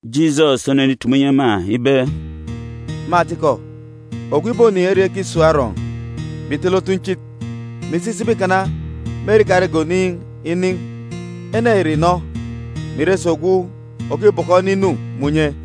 Jisọs onenitumu inyi ema ibe, “Me atikọ, ogwu ibonin̄ ere ekisun̄ arọọn̄, mè itele otunchit, mè isi isaba ikana me ere ikarege oniin̄ inin̄, ene ya ìre ogwu inọ, mè ire si ogwu òkibọkọ ene inu me unye.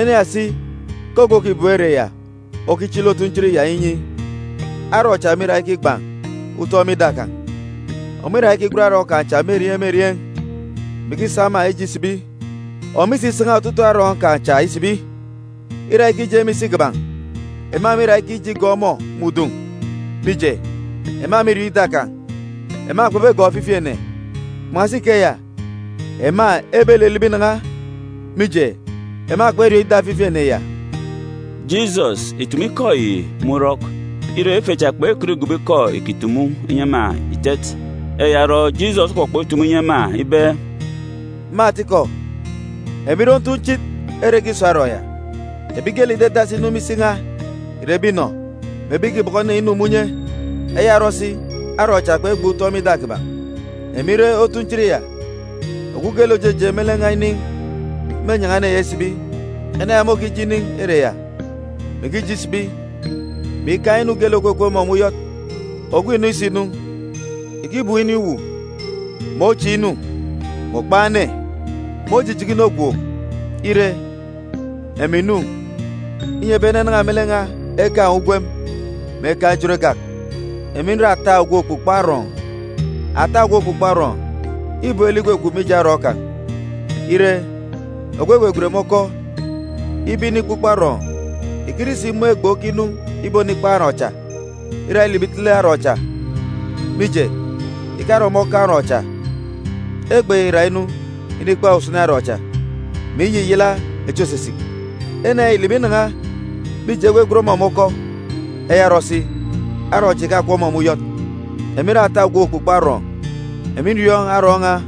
Ene ya si ke ogwu òkibem ere ya okichili otunchit ya inyi, arọọn̄ cha mîra ikigban̄ utọn̄ me ida kan̄. Ọmọ îra ikigwen arọọn̄ kan̄ cha me erieen̄ me erieen̄, mè ikisa ema ije isibi. Ọmọ isisan̄a otutuuk arọọn̄ kan̄ cha isibi, îra ikije me isi kiban̄, ema mîra ikije igọọk ọmọ me udun̄, mije, ema mîriọọn̄ ida kan̄. Ema kpebegọọk ofifi ene. Kpan̄asi ikeya, ema ebelilibi inan̄a, mije, ema kperiọọn̄ ida ofifi ene ya.” Jisọs ìtumu ikọ yi me urọk. Ire, ife cha kpekọt igobo ikọ îkitumu inyi ema itet. Eya orọ, Jisọs okpọkpọk itumu inyi ema ibe, “Me atikọ, emi nre otunchit ere ekisun̄ arọọn̄ ya. Ebi geelek ìdadasi inu me isi n̄a ìre ebi inọ mè ebi ìkibọkọ ene inu me unye. Eya orọ si arọọn̄ cha kpegban̄ utọn̄ me ida kiban̄. Emi nre otunchit ya. Ogwu geelek òjeje me lek n̄a inin̄, mênyan̄a ene ya isibi. Ene ya môkije inin̄ ere ya, mè ikije isibi, mè ikaan̄ inu geelek òkukup ọmọ me uyọt. Ogwu inọ isinu, ìkibum inin̄ uwu, mè ochiin̄ inu, mè òkpan̄ ene, mè ojijaka inu ogwook. Ire, emi ǹnu, inyi ebi ene enan̄a me lek n̄a ekaan̄ ugwem, mè ekaan̄ ejot egak. “Emi nre ata ogwu òkpukpo arọọn̄. Ata ogwu òkpukpo arọọn̄ îbem lek ikwukwu mkpa mije arọọn̄ kan̄. Ire, ogwu egwegwen me ọkọ ibe inikpukpo arọọn̄, ìkire isimun̄ ibo oron okinu ibonikpan̄ arọọn̄ cha, îra ilibi itele arọọn̄ cha, mije, ìkare ọmọ okaan̄ arọọn̄ cha. Ibo oron ya îra inu inikpan̄ usini arọọn̄ cha, mè iyiyala echi òsisik. Ene ya ìlibi inan̄a, mije, egwegwen ọmọ me ọkọ. Eya orọ si, arọọn̄ cha ìkakup ọmọ me uyọt. “Emi nre ata ogwu òkpukpo arọọn̄. Emi nriọọn̄ arọọn̄ n̄a,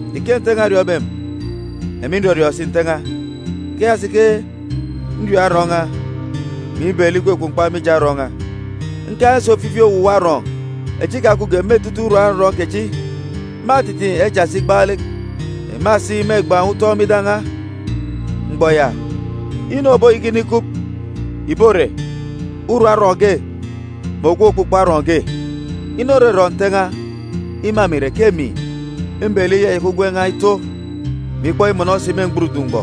Ike Nte n̄a oriọọn̄be emi, emi nrọriọọn̄ si Nte n̄a, ikeya si ke nriọọn̄ arọọn̄ n̄a, mè ibem lek ikwukwu mkpa mije arọọn̄ n̄a. Nkaan̄ si ofifi owuwa arọọn̄ echi ikakupge me etete urum arọọn̄ kechi, mâtitiin̄ echa si igbaalek. Ema si mêgban̄ utọn̄ me ida n̄a. Mgbọ ya, inu òboyaka inikup ìbore urum arọọn̄ ge mè ogwu òkpukpo arọọn̄ ge. Inu òrọrọ Nte n̄a ima emi ìre ke emi mbem lek iyayaka ugwem n̄a ito, mè ikpọk imọnọ si me mgburudun̄ mgbọ.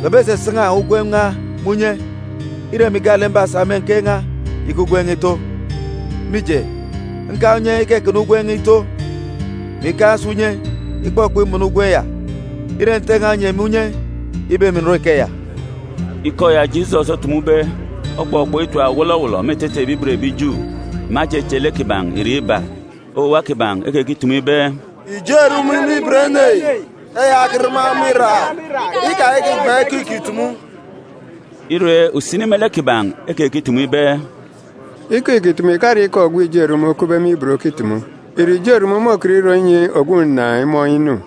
Kpebesasan̄a ugwem n̄a me unye, îre emi gaalek mbasa me nkeek n̄a iyaka ugwem n̄a ito. Mije, nkaan̄ unye ikakana ugwem n̄a ito, mè ikaan̄ si unye ikpọkpọk imọnọ ugwem ya. Îre Nte n̄a onyi emi unye ibe emi ǹrọ ikeya.” Ikọ ya Jisọs otumube okpọkpọk itap wọlọwọlọ me etete ebi ibot ebi Ju. Ema echeche lek kiban̄ irek iba. Owuwa kiban̄ ekekitumu ibe, “Ijo erumun̄ me ibot ene yi. Eya okirama ọmọ iraak. Ikayaka ìgban̄ ikọ îkitumu.” Ire, usini me lek kiban̄ ekekitumu ibe, “Ikọ îkitumu ìkare ikọ ogwu ijo erumun̄ okupbe me ibot okitumu. Ìre ijo erumun̄ môkọt irọ inyi ogwu ǹnàan̄ imọọn̄ inu?”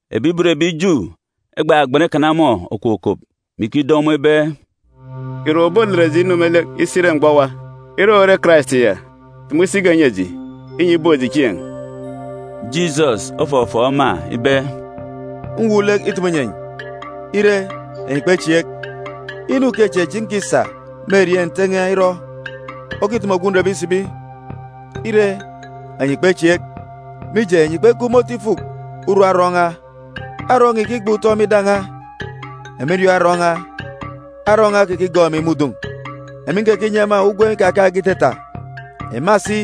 Ebi ibot ebi Ju egbagban ikana ọmọ okokop, me ikido ọmọ ibe, “Ìre owu òbolet eji inu me lek isi ire mgbọ owa? Ire owu ore Karais ya, tumu isi ge nyi eji, inyi ibook eji chieen̄.” Jisọs ofọfọọk ema ibe, “Mwuuk lek itumu inyi enyi. Ire, enyi kpechieek. Inu ukechieen̄ echi nkisa me erieen̄ kè Nte n̄a irọ okitumu ogwu nrebe isibi. Ire, enyi kpechieek, mije, enyi kpekup me otu ifuk urum arọọn̄ n̄a. Arọọn̄ n̄a îkigban̄ utọn̄ me ida n̄a. Emi nriọọn̄ arọọn̄ n̄a, arọọn̄ n̄a okekigọọk emi me udun̄, emi nkekinyi ema ugwem ikakaan̄ge itata. Ema si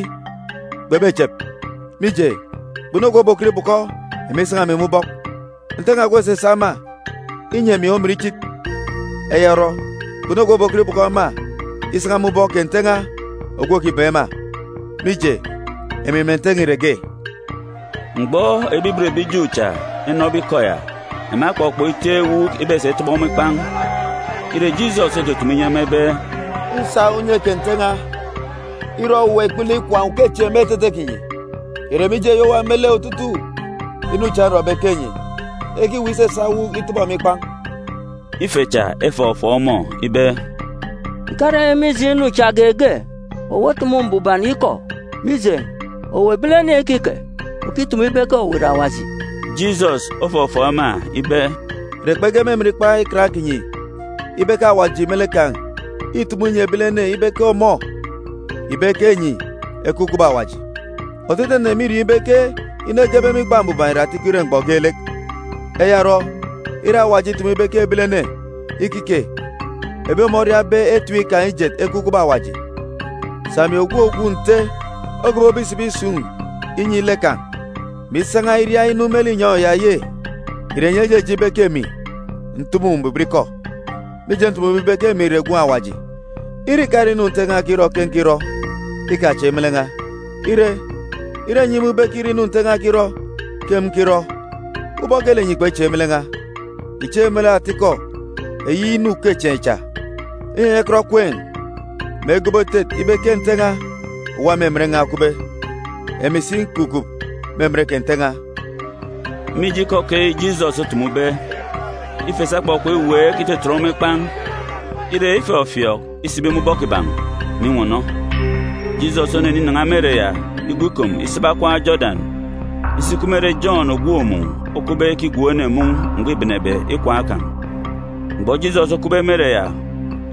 kpebechep, mije, kpunu ogwu òbokọt ibọkọ ema isan̄a emi me ubọk. Nte n̄a ogwu òsasa ema inyi emi omin ichit. Eya orọ, kpunu ogwu òbokọt ibọkọ ema isan̄a me ubọk kè Nte n̄a ogwu òkibem ema. Mije, emi mè Nte n̄a ìre ge.” Mgbọ ebi ibot ebi Ju cha enọbe ikọ ya, ema ekpọkpọk iteen̄ ewuuk ibesa itọbọ ọmọ ikpan̄. Ire, Jisọs otutumu inyi ema ibe, “Nsa unye kè Nte n̄a irọ owuwa ikpele ikwaan̄ ukechieen̄ me etete kinyi. Ìre mije eyi owa me lek otutuuk inu cha nrọbe ke enyi ekiweek isasa ewuuk itọbọ emi ikpan̄?” Ife cha efọfọọk ọmọ ibe, “Ìkare mije inu cha geege. Owu otumu mbuban ikọ. Mije, owu, ebilene ikike, okitumu ibe ke owu ìre Awaji.” Jisọs ofọfọọk ema ibe, “Ìre kpege me emen Ikpa Ikan kinyi ibe ke Awaji me lek kan̄ îtumu inyi ebilene ibe ke ọmọ ìbe ke enyi ekup kubọk Awajib? Otutuuk ene mîriọọn̄ ibe ke inu egebe me Ikpa Mbuban ìre atikọ ire mgbọ geelek. Eya orọ, ire Awaji itumu ibe ke ebilene ikike ebi ọmọ oriabe etip kan̄ ijet ekup kubọk Awaji, sà emi ogwu Ogwu Nte ogobobe isibi isun̄ inyi lek kan̄, mè isan̄a iria inu me linyọn̄ ya ye? Ìre enyi ejeje ibe ke emi ntumu mbuban ikọ, mije ntumube ibe ke emi ìre Gwun̄ Awaji? Ire ìkare inu Nte n̄a okirọ ke nkirọ, ikachieek me lek n̄a. Ire, ire enyi imun̄ ibe ke îre inu Nte n̄a okirọ ke emi nkirọ, ubọk geelek enyi kpechieek me lek n̄a, ìchieek me lek ata-ikọ eyi inu ukechieen̄ cha, inyi enyi ekọt ekween̄, mè egobo etet ibe ke Nte n̄a òwa me emen n̄a okupbe, emi si nkukup me emen kè Nte n̄a.” Mije ikọ keyi Jisọs otumube, ife cha ekpọkpọk iweek itetet ọmọ ikpan̄. Ire, ifọfiọọk isibi me ubọk kiban̄, mè inwọnọ. Jisọs oneninan̄a me ere ya igwu ikom isaba okwaan̄ Jodan isi ikup me ere Jọn ògwook mun̄ okupbe ikigwook ene mun̄ mgbọ îbenebe ikwaan̄ kan̄. Mgbọ Jisọs okupbe me ere ya,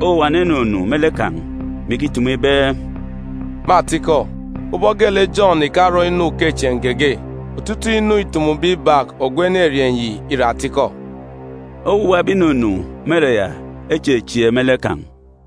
owuwa ene enunu me lek kan̄, mè ikitumu ibe, “Me atikọ, ubọk geelek Jọn ìkarọ inu ukechieen̄ geege, otutuuk inu îtumube ibak ogwu enerieen̄ yi ìre atikọ.” Owuwa ebi ìnunu me ere ya echechieek me lek kan̄.